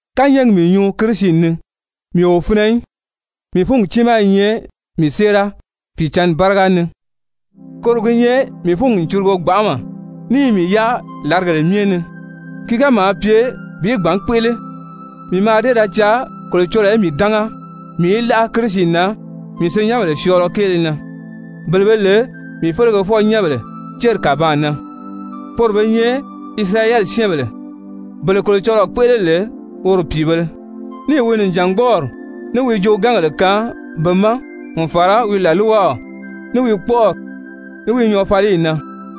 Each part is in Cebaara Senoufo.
Kányɛɛgi mii nyuu Kirisi ni, mii o finɛ í, mii fúngi tiimaa i nyɛ mii séera Pìicǎnni báriga ni. Koro gi nyɛ mii fúngi n curugo gbanʔama ní i mii yáa làrigèle myɛ ni. Ki ga maa pye bi gbǎn kpéʔele, mii mǎà dée ra caa Kolocɔlɔɔ í mii dánga mii í láʔa Kirisi na mii senyɛnbèle syɔɔlɔ kéele na, bele be lè mii felegefɔ-nyɛ́nbèle céri kàbaan na. Poro be nyɛ Isirayɛli syɛ́ɛnbèle, bele Kolocɔlɔɔ kpéʔele lè woro pìibēle, níì wi nìjangbɔɔri, ní wi joogaangèle kaan be ma, n fàra wi làlwaw, ní wi kpɔ̀ʔɔrɔli, ní wi nyɔɔfaliyi na.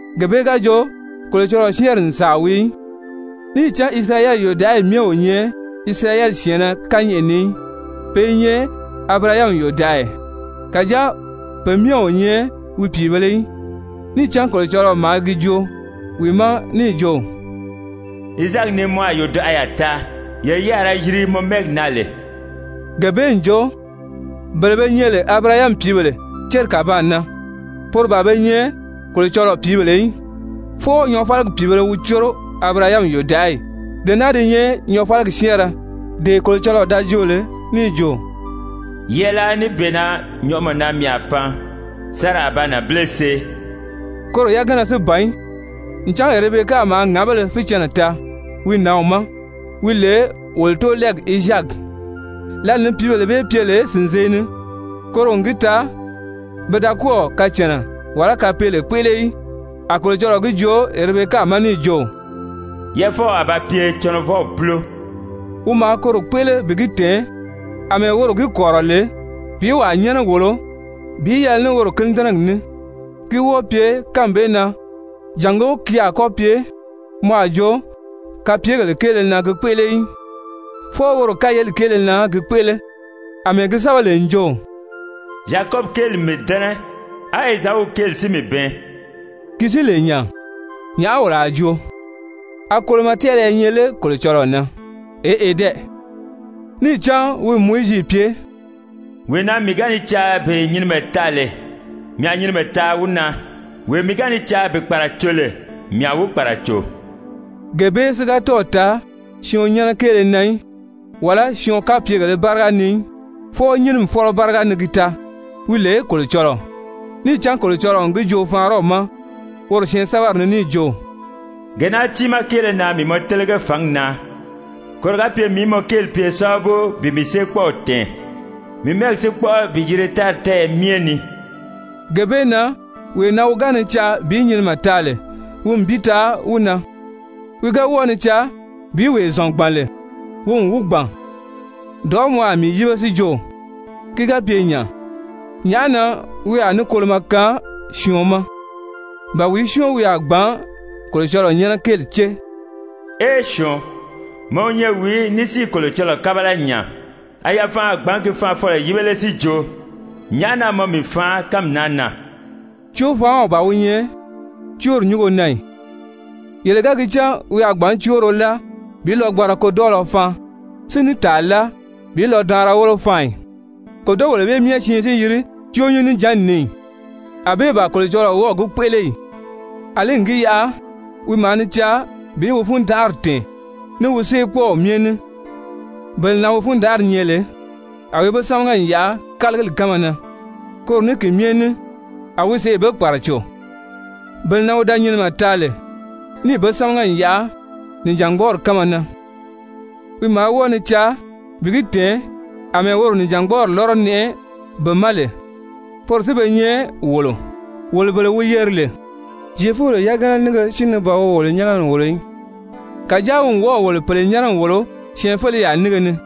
Gee bee ga jo Kolocɔlɔɔ syɛ́ɛnri n sàa wii í. Níì cán Isirayɛli yòdaʔayi myɛ o nyɛ Isirayɛli syɛ̀ɛnnɛ kányɛʔɛ ni í. Pe i nyɛ Abirahami yòdaʔaya, kàjáa pe myɛ o nyɛ wi pìibēle í. Níì cán Kolocɔlɔɔ maa gi joo wi ma níì jo: «Izaaki ni mɔ a yodaʔaya taa, yee yi a ra yiri mɔ mɛ́ɛgi na lè.» Gee bee n jo bele be nyɛ lè Abirahami pìíbèle céri kàbaan na, poro ban be nyɛ Kolocɔlɔɔ pìíbèle í, fwɔɔ nyɔɔfaligi pìibēle wi córo Abirahami yòdaʔayi. Dee naa di nyɛ nyɔɔfaligi syɛ́ɛnrɛ, dee Kolocɔlɔɔ da joo lè níì jo: «Yɛɛláa níbeena nyɔʔɔmɔ na mii a pan, Sara a ba nànbile see.» Koro yagana si ban í, ncan Erebeka maa ŋǎbéle fícɛnnɛ taa wi nǎnw ma, wi lè wolo tóolɛɛw Izaaki. Lǎli ni pìíbèle bee pye lè sìnzee ni, koro n gi taa pe da kɔ́ɔ̀ kacànna wàlá kapeele kpéʔele í, a Kolocɔlɔɔ gi joo Erebeka ma níì jo: «Yɛʔɛfɔw a ba pye cɔnɔvɔw púlo.» Wi maa koro kpéʔele bi gi tɛ̀ɛn àmɛɛ woro gi kɔ̀rirɔ lè bi wàa nyɛ́nɛ wòlo bi yɛlɛ ní woro kínidɛnɛgi ní, ki wɔ́ɔ pye kánmi bee na, jàngó ki a kɔ́ ba pye mɔ a jo kapyegèle kéele na gi kpéʔele í, fwɔɔ woro kayeli kéele na gi kpéʔele. Amɛɛ gi sɛ́bɛ lè n jo: «Zyakɔbi kéeli n mii dɛ́nɛ, á Ezau kéeli si mii bɛɛn.» Ki si i lè nya, nyàʔá wolo a joo? A kolomɔ tɛ́ɛlɛ i nyɛ lé Kolocɔlɔɔ na? Eʔe dɛ! Níì cán wi n Mowizi pye: «Wee na mii ga ni caa bi nyinimɛ taa lè, mii a nyinimɛ taa wi na. Wee mii ga ni caa bi kpàraco lè, mii a wi kpàraco.» Gee bee si ga tɔ́ɔ̀ taa syɔɔn nyɛ́nɛ kéele na í, wàlá syɔɔn kapyegèlē báriga ni í, fwɔɔ nyínimi fɔ́lɔ báriga ni gi taa, wi lè Kolocɔlɔɔ. Níì cán Kolocɔlɔɔ n gi joo Faraɔn ma woro syɛɛnsɛbɛri ni níì jo: «Gee naa tiimaa kéele na mii mɔ télege fǎngi na, koro ga pye mii í mɔ kéeli pye sábabu bi mii séekpɔɔw tɛ̀ɛn, mii mɛ́ɛgi si kpɔ́ʔɔ bi yiri tári tɛ́ɛyɛ myɛ ni.» Gee bee na wee na wi ga ni caa bi nyinimɛ taa lè, wi n bi taa wi na, wi ga wɔ́ɔ ni caa bi wee zɔ̀n gbàn lè, wi n wi gbàn. Dɔ̀ʔɔ́ mɔ a mii yíbe si jo: «Ki ga pye nya, nyàʔá na wi a ní kolomɔ kaan syɔɔn ma? Ba wìí syɔ́ɔn wi a gbǎn Kolocɔlɔɔ nyɛ́nɛ kéeli cée?» Ee syɔɔn, mɔ wi nyɛ wìí ní si i Kolocɔlɔɔ kábala nya? A yafanʔa a gbǎn gi faanfɔlɔ yíbe lé si jo: «Nyàʔá na mɔ mii faan kánmi naa na?» Cóofaanw ban wi nyɛ cóori nyúngo na ì? Yele ga gi cán wi a gbǎn cóoro láa bi lɔgbanra kodɔɔlɔ faan si ní tàa láa bi lɔdaanra wólo faan ì, kòdogèle bee myɛ siin si yiri cóonyín-níjanni ni ì? Anbée ban Kolocɔlɔɔ wɔ́ɔ̀ gi kpéʔele ì? Alí n gi yaʔa wi maa ni caa bi wi fundanʔari tɛ̀ɛn ní wi séekpɔɔw myɛ ní, bele na wi fundanʔari nyɛ lè, a wi be sámaga n yaʔa kálagili kánma na, koro ní ki myɛ ní a wi sèʔê be kpàraco. Bele na wi da nyinimɛ taa lè níì be sámaga n yaʔa nìjangbɔɔri kánma na, wi maa wɔ́ɔ ni caa bi gi tɛ̀ɛn àmɛɛ woro nìjangbɔɔri lɔ́rɔ nɛʔɛ be ma lè. Poro si be nyɛ wolo, wolo bele wi yeri lè, Zyefubèle yagana nínge si ni ban wi wolo nyɛ́nɛ n wòlo í, kàjáa wi n wɔ́ɔ̀ wolo pèle nyɛ́nɛ n wòlo syɛɛnfeleyaa nínge ni.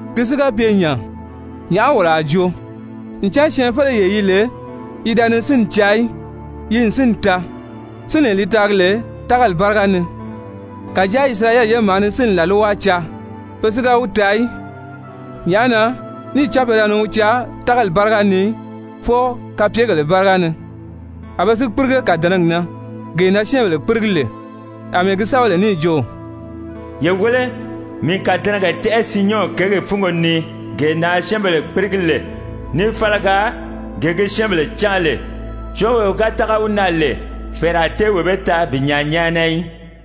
Ki si ga pye nya, nyàʔá wolo a joo? Ncan syɛɛnfeleyee yi lè yi da ni sínni caa í, yi n sínni taa, sínlee li taagi lè tágali báriga ni, kàjáa Isirayɛli ye maa ni sínni làlwa caa, pe si ga wi taa í. Nyàʔá na? Níì cán pe da ni wi caa tágali báriga ni í, fwɔɔ kapyegèle báriga ni. A be si kpírige kàdɛnɛgi na gee na syɛ́ɛnbèle kpírigi lè. Amɛɛ gi sɛ́bɛ lè níì jo: «Ye wéle, mii n kàdɛnɛgɛ tɛ́ʔɛ Siyɔn kěgi fúngo ni gee na syɛ́ɛnbèle kpírigi lè, ní fálaga, gee gi syɛ́ɛnbèle cáan lè, syɔ́ɔnwee wi tága wi na lè, fɛ̀ɛrɛ a tée wee bee taa bi nyaa nyáana í.»